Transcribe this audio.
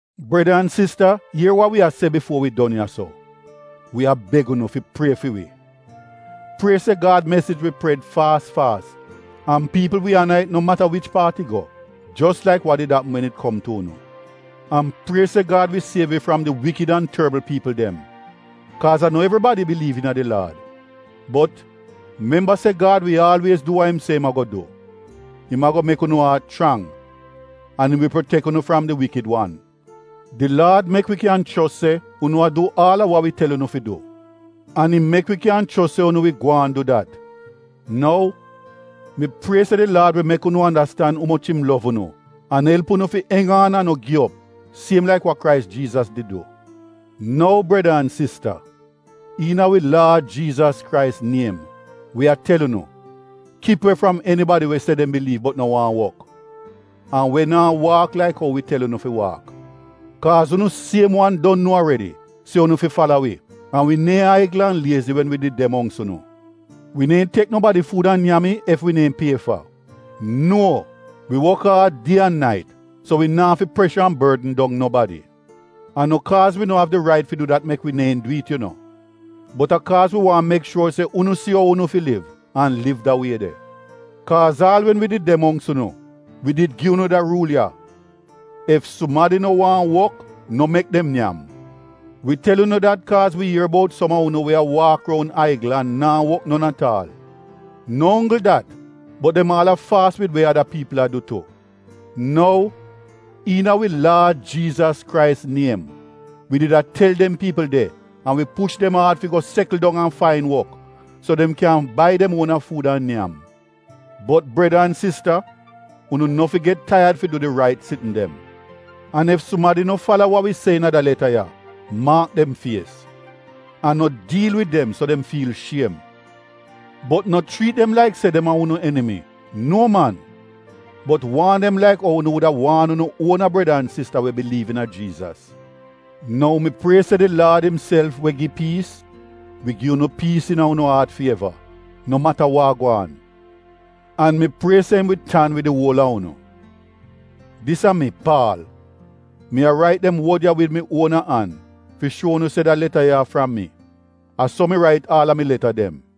Breda an sista ier wa wi a se bifuo wi don ya-so — wi a beg unu fi prie fi wi. Prie se Gad mesij wi pred faas faas an piipl wi ana it no mata wich paat it go, jos laik wa did apm wen it kom tu unu. An prie se Gad wi siev wi fram di wikid an torbl piipl dem, kaaz a no evribadi biliiv iina di Laad. Bot, memba se Gad wi aalwiez du wa im se im ago du. Im ago mek unu aat chrang, an im wi protek unu fram di Wikid Wan. Di Laad mek wi kyan chos se unu a du aal a wa wi tel unu fi du. An im mek wi kyan chos se unu wi gwaan du dat. Nou, mi prie se di Laad wi mek unu andastan umoch im lov unu an elp unu fi eng aan an no gi op siem laik wa Krais Jiizas did du. Nou, breda an sista, iina wi Laad Jiizas Krais niem, wi a tel unu, kip we fram enibadi we se dem biliiv bot no waahn wok, an we naa waak laik ou wi tel unu fi waak. Kaaz unu siem wan don nuo aredi se unu fi fala wi, an wi neehn aigl an liezi wen wi did de mongks unu. Wi neehn tek nobadi fuud an nyam it ef wi neehn pie fa. Nuo, wi wok aad, die an nait so wi naa fi presha an bordn dong nobadi. A no kaaz wi no av di rait fi du dat mek wi neehn du it yu no, bot a kaaz wi waahn mek shuor se unu si ou unu fi liv, an liv da wie de. Kaaz aal wen wi did de mongks unu, wi did gi unu da ruul ya, “Ef sumadi no waahn wok no mek dem nyam.” Wi tel unu dat kaaz wi ier bout som a unu we a waak roun aigl an naa wok non at aal. No onggl dat, bot dem aal a faas wid we ada piipl a du tu. Nou, iina wi Laad Jiizas Krais niem, wi did a tel dem piipl de an wi push dem aad fi go sekl dong an fain wok so dem kyan bai dem uona fuud an nyam. Bot breda an sista, unu no fi get taiyad fi du di rait sitn dem. An ef sumadi no fala wa wi se iina da leta ya maak dem fies, an no diil wid dem so dem fiil shiem. Bot no chriit dem laik se dem a unu enimi, nuo man. Bot waan dem laik ou unu wuda waan unu uona breda an sista we biliiv iina Jiizas. Nou mi prie se di Laad imself we gi piis, wi gi unu piis iina unu aat fi eva, no mata wa de gwaan. An mi prie se im wi tan wid di uol a unu. Dis a mi, Paal. Mi a rait dem wod ya wid mi uona an fi shuo unu se da leta ya a fram mi. A so mi rait aal a mi leta dem.